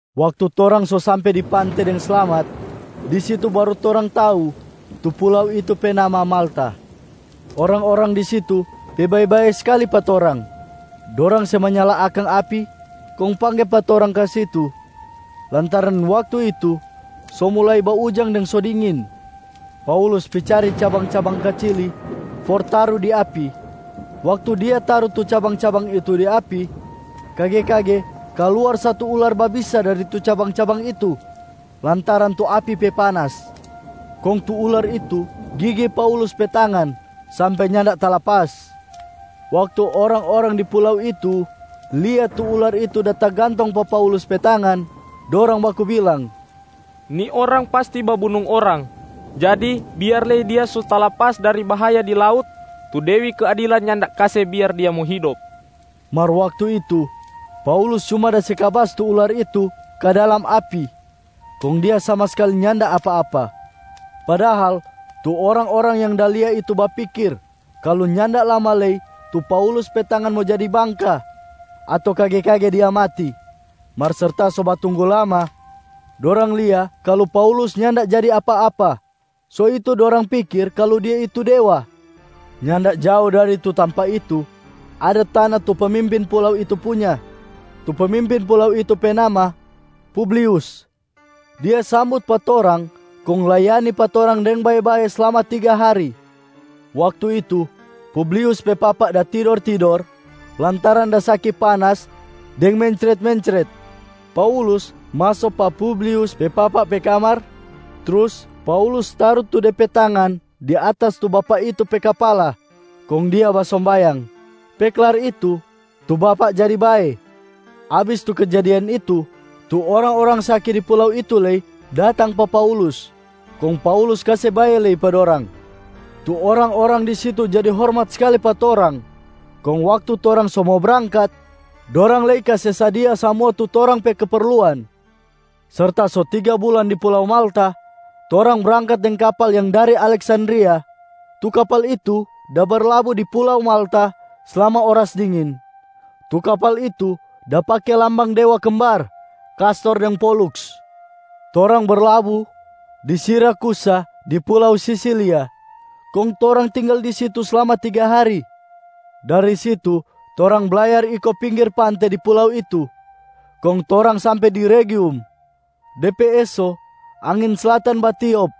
Waktu torang so sampe di pante deng slamat, di situ baru torang tau tu pulau itu pe nama Malta. Orang-orang di situ pe bae-bae skali pa torang. Dorang se manyala akang api kong pangge pa torang ka situ, lantaran waktu itu so mulai baujang deng so dingin. Paulus pi cari cabang-cabang kacili for taru di api. Waktu dia taru tu cabang-cabang itu di api, kage-kage kaluar satu ular babisa dari tu cabang-cabang itu lantaran tu api pe panas. Kong tu ular itu gigi Paulus pe tangan sampe nyanda talapas. Waktu orang-orang di pulau itu lia tu ular itu da tagantong pa Paulus pe tangan, dorang baku bilang, “Ni orang pasti babunung orang. Jadi biar lei dia so talapas dari bahaya di laut, tu Dewi Keadilan nyanda kase biar dia mo hidop.” Mar waktu itu, Paulus cuma da se kabas tu ular itu ka dalam api kong dia sama skali nyanda apa-apa. Padahal tu orang-orang yang da lia itu bapikir kalu nyanda lama lei tu Paulus pe tangan mo jadi bangka ato kage-kage dia mati. Mar serta so batunggu lama, dorang lia kalu Paulus nyanda jadi apa-apa, so itu dorang pikir kalu dia itu dewa. Nyanda jao dari tu tampa itu, ada tana tu pemimpin pulau itu punya. Tu pemimpin pulau itu pe nama Publius. Dia sambut pa torang kong layani pa torang deng bae-bae slama tiga hari. Waktu itu, Publius pe papa da tidor-tidor lantaran da saki panas deng mencret-mencret. Paulus maso pa Publius pe papa pe kamar, trus Paulus taru tu de pe tangan di atas tu bapak itu pe kapala kong dia basombayang. Pe klar itu, tu bapak jadi bae. Abis tu kejadian itu, tu orang-orang saki di pulau itu lei datang pa Paulus, kong Paulus kase bae lei pa dorang. Tu orang-orang di situ jadi hormat skali pa torang. Kong waktu torang so mo brangkat, dorang lei kase sadia samua tu torang pe keperluan. Serta so tiga bulan di pulau Malta, torang brangkat deng kapal yang dari Aleksandria. Tu kapal itu da berlabu di pulau Malta slama oras dingin. Tu kapal itu da pake lambang ‘Dewa Kembar Kastor deng Poluks’. Torang berlabu di Sirakusa di pulau Sisilia, kong torang tinggal di situ slama tiga hari. Dari situ torang blayar iko pinggir pante di pulau itu, kong torang sampe di Regium. De pe eso angin slatan batiop,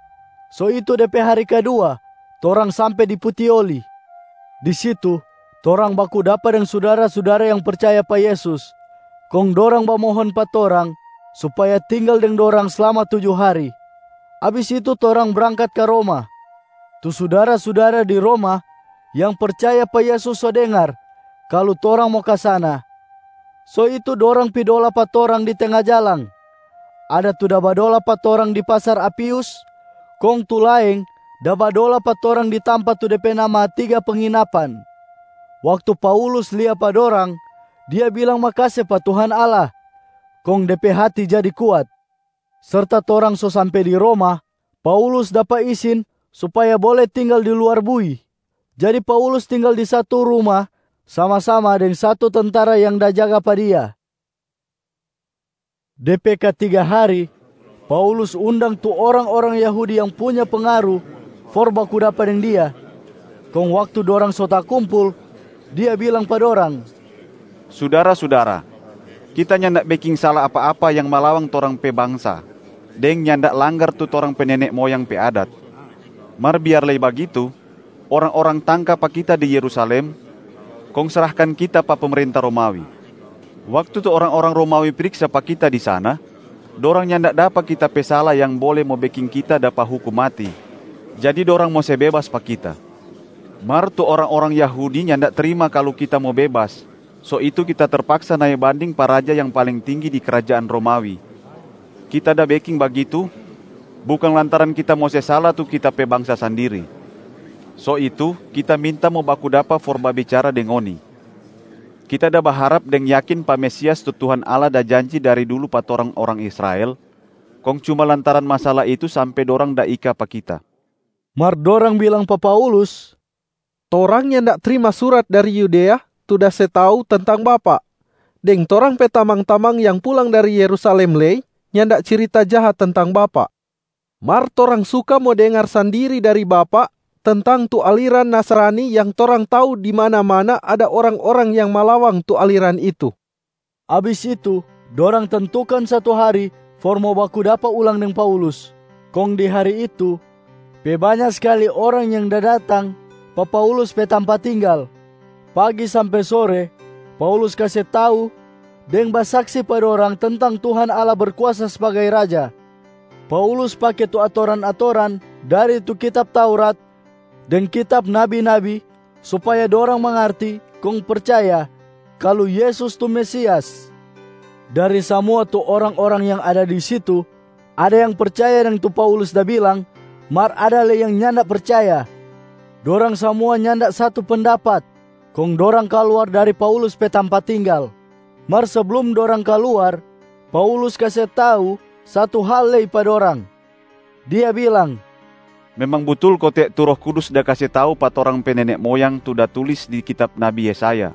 so itu de pe hari kadua torang sampe di Putioli. Di situ, torang baku dapa deng sudara-sudara yang percaya pa Yesus kong dorang bamohon pa torang supaya tinggal deng dorang slama tuju hari. Abis itu torang brangkat ka Roma. Tu sudara-sudara di Roma yang percaya pa Yesus so dengar kalu torang mo ka sana. So itu dorang pi dola pa torang di tenga jalang. Ada tu da badola pa torang di Pasar Apius, kong tu laeng da badola pa torang di tampa tu de pe nama Tiga Penginapan. Waktu Paulus lia pa dorang, dia bilang makase pa Tuhan Allah kong de pe hati jadi kuat. Serta torang so sampe di Roma, Paulus dapa isin supaya bole tinggal di luar bui, jadi Paulus tinggal di satu ruma sama-sama deng satu tentara yang da jaga pa dia. De pe katiga hari, Paulus undang tu orang-orang Yahudi yang punya pengaru for baku dapa deng dia. Kong waktu dorang so takumpul, dia bilang pa dorang, “Sudara-sudara! Kita nyanda beking sala apa-apa yang malawang torang pe bangsa deng nyanda langgar tu torang pe nene moyang pe adat. Mar biar lei bagitu, orang-orang tangka pa kita di Yerusalem, kong srahkan kita pa pemerenta Romawi. Waktu tu orang-orang Romawi priksa pa kita di sana, dorang nyanda dapa kita pe sala yang bole mo beking kita dapa hukum mati, jadi dorang mo se bebas pa kita. Mar tu orang-orang Yahudi nyanda trima kalu kita mo bebas, so itu kita terpaksa nae banding pa raja yang paling tinggi di krajaan Romawi. Kita da beking bagitu bukang lantaran kita mo se sala tu kita pe bangsa sandiri. So itu kita minta mo baku dapa for babicara deng ngoni. Kita da baharap deng yakin pa Mesias tu Tuhan Allah da janji dari dulu pa torang orang Israel, kong cuma lantaran masala itu sampe dorang da ika pa kita.” Mar dorang bilang pa Paulus, “Torang nyanda trima surat dari Yudea tu da se tau tentang bapak, deng torang pe tamang-tamang yang pulang dari Yerusalem lei nyanda cirita jaha tentang bapak. Mar torang suka mo dengar sandiri dari bapak tentang tu aliran Nasrani yang torang tau di mana-mana ada orang-orang yang malawang tu aliran itu.” Abis itu dorang tentukan satu hari for mo baku dapa ulang deng Paulus. Kong di hari itu, pe banya skali orang yang da datang pa Paulus pe tampa tinggal. Pagi sampe sore Paulus kase tau deng basaksi pa dorang tentang Tuhan Allah Berkuasa sbagai Raja. Paulus pake tu atoran-atoran dari tu kitab Taurat deng kitab nabi-nabi supaya dorang mangarti kong percaya kalu Yesus tu Mesias. Dari samua tu orang-orang yang ada di situ, ada yang percaya deng tu Paulus da bilang, mar ada lei yang nyanda percaya. Dorang samua nyanda satu pendapat kong dorang kaluar dari Paulus pe tampa tinggal. Mar seblum dorang kaluar, Paulus kase tau satu hal lei pa dorang, dia bilang, “Memang butul kote tu Roh Kudus da kase tau pa torang pe nene moyang tu da tulis di kitab nabi Yesaya.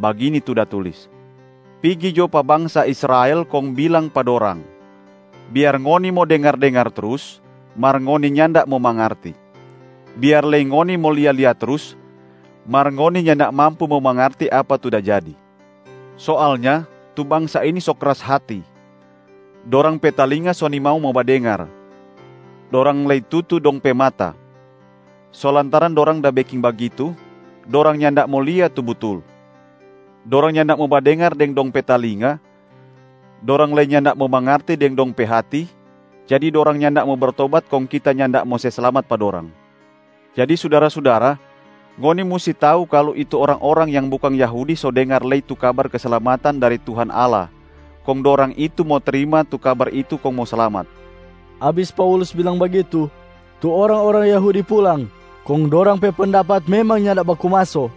Bagini tu da tulis, ‘Pigi jo pa bangsa Israel kong bilang pa dorang: Biar ngoni mo dengar-dengar trus, mar ngoni nyanda mo mangarti. Biar lei ngoni mo lia-lia trus, mar ngoni nyanda mampu mo mangarti apa tu da jadi. Soalnya tu bangsa ini so kras hati. Dorang pe talinga so nimau mo badengar, dorang lei tutu dong pe mata. So lantaran dorang da beking bagitu, dorang nyanda mo lia tu butul. Dorang nyanda mo badengar deng dong pe talinga, dorang lei nyanda mo mangarti deng dong pe hati, jadi dorang nyanda mo bertobat kong Kita nyanda mo se slamat pa dorang.’ Jadi sudara-sudara, ngoni musti tau kalu tu orang-orang yang bukang Yahudi so dengar lei tu kabar keslamatan dari Tuhan Allah, kong dorang itu mo trima tu kabar itu kong mo slamat.” [ Abis Paulus bilang bagitu, tu orang-orang Yahudi pulang kong dorang pe pendapat memang nyanda baku maso.]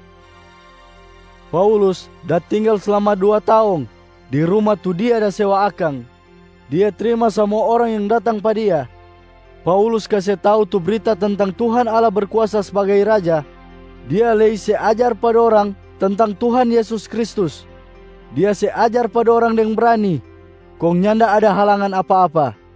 Paulus da tinggal slama dua taong di ruma tu dia da sewa akang. Dia trima samua orang yang datang pa dia. Paulus kase tau tu brita tentang Tuhan Allah Berkuasa sbagai Raja, dia lei se ajar pa dorang tentang Tuhan Yesus Kristus. Dia se ajar pa dorang deng brani, kong nyanda ada halangan apa-apa.